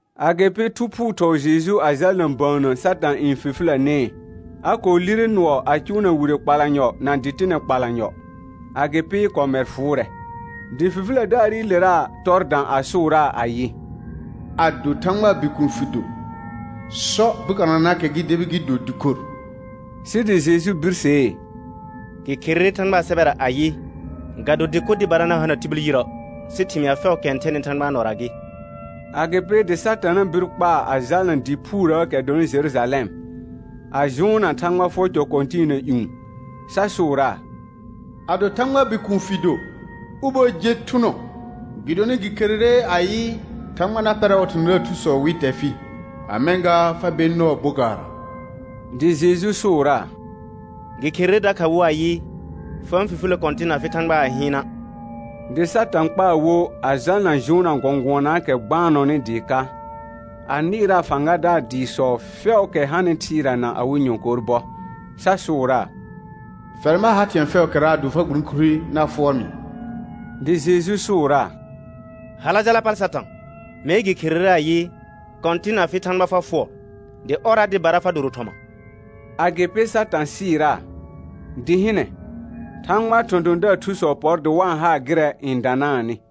Agɩpɩ Thu Phuu thɔɔ Jeju a jalna bəənnə Satã n fifilənee. A kɔɔ lire nʋɔ a cʋʋna wire kpalanyɔ na dɩtɩnɛ kpalanyɔ, agɩpɩ kɔmɛr fʋʋrɛ. Dɩ fifilədaarɩlera tɔr dã a sʋʋraa ayɩ: Ado Thãgbaa Bikuun fɩ do, sɔ bokananaakɛ gɩ debi gɩ do dɩkor. Sɩ dɩ Jeju birsee: Gɩ kherere Thãgbaa sɛbɛra ayɩ: «Ga do dɩkor dɩbara na hana tibil yirə', sɩ thɩmɩa fɛʋʋkɛ n thɛnɩ Thãgbaa nɔra gɩ.» Agɩpɩ dɩ Satana bir kpaa a jalna dɩ phuurəəkɛ dɔnɩ Jerujalɛm, a jʋʋnna Thãgba fʋɔr cɔ kɔ̃tɩɩna ƴũ, sa sʋʋraa: Ado Thãgbaa Bikuun fɩ do, ubo je thʋnɔ, gɩdonɩ gɩ kherere ayɩ: «Thãgba na pɛrɛ ɔɔ thɔ̃thɔ̃daar thusɔ wɩ tɛ fɩ, a mɛ̃ gaa fa ber nɔɔ bokaarra.» Dɩ Jeju sʋʋraa: Gɩ kherere dakha wo ayɩ: «Fa-n fifilə Kɔ̃tɩn afɩ Thãgba a hɩɩna'.» Dɩ Satã kpaa wo a jalna jʋʋnna gɔ̃gʋɔnaakɛ gbaanɔnɩ dɩɩ ka, a nɩɩraa fãgadaar dɩɩsɔ fɛʋʋkɛ hanɩ thɩɩra na awɩ nyɔ̃kor bɔ, sa sʋʋraa: Fɛr ma ha thɩ̃ɛ fɛʋʋkɛra ado fa gburõkure na fʋɔr mɩ. Dɩ Jeju sʋʋraa: Hala jala pal Satã. Mee gɩ kherere ayɩ: «Kɔ̃tɩn afɩ Thãgba fa fʋɔr, dɩ ɔrra dɩbara fa doro thɔma.» Agɩpɩ Satã sɩɩraa, dɩ hɩnɛ, Thãgbaa thɔ̃thɔ̃daar thusɔ pɔr dɩ wa-n haa gɩrɛ n danaanɩ.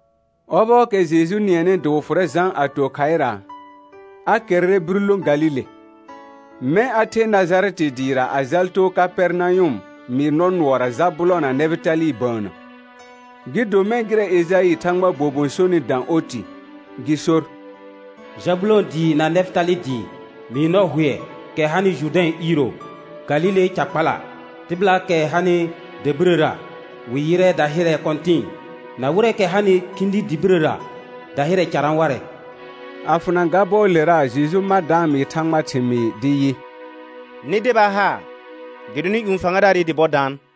Ɔbɔɔkɛ Jeju nɩɛnɩ dɩ wɩ fʋrɛ Jã a to khaɩra, a kɛrrɛ bir lõ Galile. Mɛ̃ a the Najarɛtɩ dɩɩra a jal too Kapɛrnayʋm mɩɩr nɔ nʋɔra Jabʋlɔ̃ na Nɛfɩtalɩ bəənnə. Gɩ do mɛ̃ gɩrɛ Ejaɩ Thãgbaa bobon sonɩ dã oti, gɩ sor: «Jabʋlɔ̃ dɩɩ na Nɛfɩtalɩ dɩɩ, mɩɩr nɔ hʋɛ, kɛ hanɩ Jʋrdɛ̃ iiro, Galile ca kpala. Tɩbɩlaakɛ hanɩ dabirəra, wɩ yɩrɛ dahɩrɛ kɔ̃tɩ̃ɩ, na wɩrɛɛkɛ hanɩ khĩdi dɩ birəra, dahɩrɛ carã warɛ.» A fʋna ga bɔɔlera Jeju ma da-n mɩɩ Thãgbaa thɩmɩɩ dɩ yɩ: Nɩ deba haar, gɩdonɩ ƴũ fãgadaarɩ dɩ bɔ daan.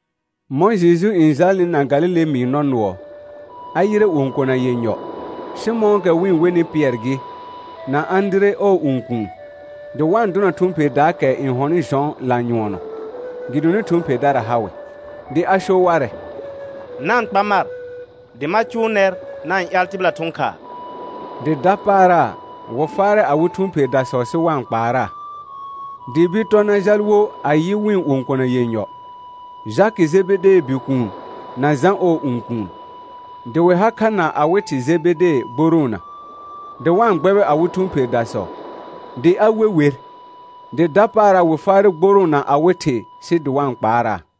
Mɔ̃ Jeju n jalnɩ na Galile mɩɩr nɔ nʋɔ, a yɩrɛ õkona yenyɔ, Sɩmɔ̃ɔkɛ wɩ-n wenɩ Pɩɛr gɩ, na Ãdire ɔɔ õkuun, dɩ wa-n dʋna thʋ̃ pherdaakɛ n hɔnɩ jɔ̃ lanyʋɔnɔ, gɩdonɩ thʋ̃ pherdara ha wɩ. Dɩ a so warɛ: Na-n kpa mar, dɩ ma cʋʋ nɛr na-n ƴaal tɩbɩla thʋ̃ khaa. Dɩ dapaara, wɩ faarɛ awɩ thʋ̃ pherdasɔ sɩ wa-n kpaaraa. Dɩ bir tɔ na jal wo a yɩ wɩ̃ õkona yenyɔ, Jakɩ Jebedee bikuun, na Jã ɔɔ õkuun, dɩ wɩ ha kha na awɩ thɩ Jebede gboroona, dɩ wa-n gbɛbɩ awɩ thʋ̃ pherdasɔ. Dɩ a we wer, dɩ dapaara wɩ faarɛ gborõo na awɩ thɩ sɩ dɩ wa-n kpaaraa.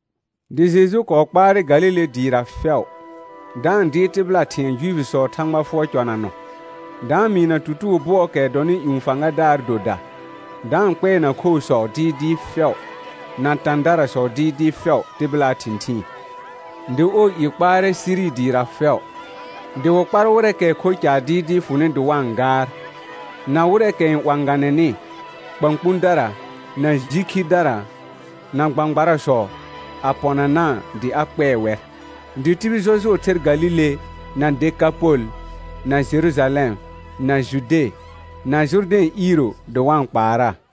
Dɩ Jeju kɔɔ kpaarɛ Galile dɩɩra fɛʋ, da-n dɩɩr tɩbɩla thɩ̃ɛ Juifisɔɔ Thãgba fʋɔr cɔnanɔ, da-n mɩɩna tutugo bʋɔɔkɛ dɔnɩ ƴũ fãgadaar doda, da-n kpɛɛna khoosɔ dɩɩdɩɩ fɛʋ, na tãdarasɔ dɩɩdɩɩ fɛʋ tɩbɩlaa thɩ̃thɩɩn. Dɩ ɔɔ i kpaarɛ Siri dɩɩra fɛʋ. Dɩ wɩ kpar wɩrɛɛkɛ kho caar dɩɩdɩɩ fʋnɩ dɩ wa-n gaar, na wɩrɛɛkɛ n 'wãganɛnɩ: Kpãkpũdara, na ji khidara, na gbãgbarasɔ a pɔnanaa dɩ a kpɛɛ wɛr. Dɩ tibil jɔjʋɔ ther Galile, na Dekapol, na Jerujalɛm, na Jude, na Jʋrdɛ̃ iiro dɩ wa-n kpaaraa.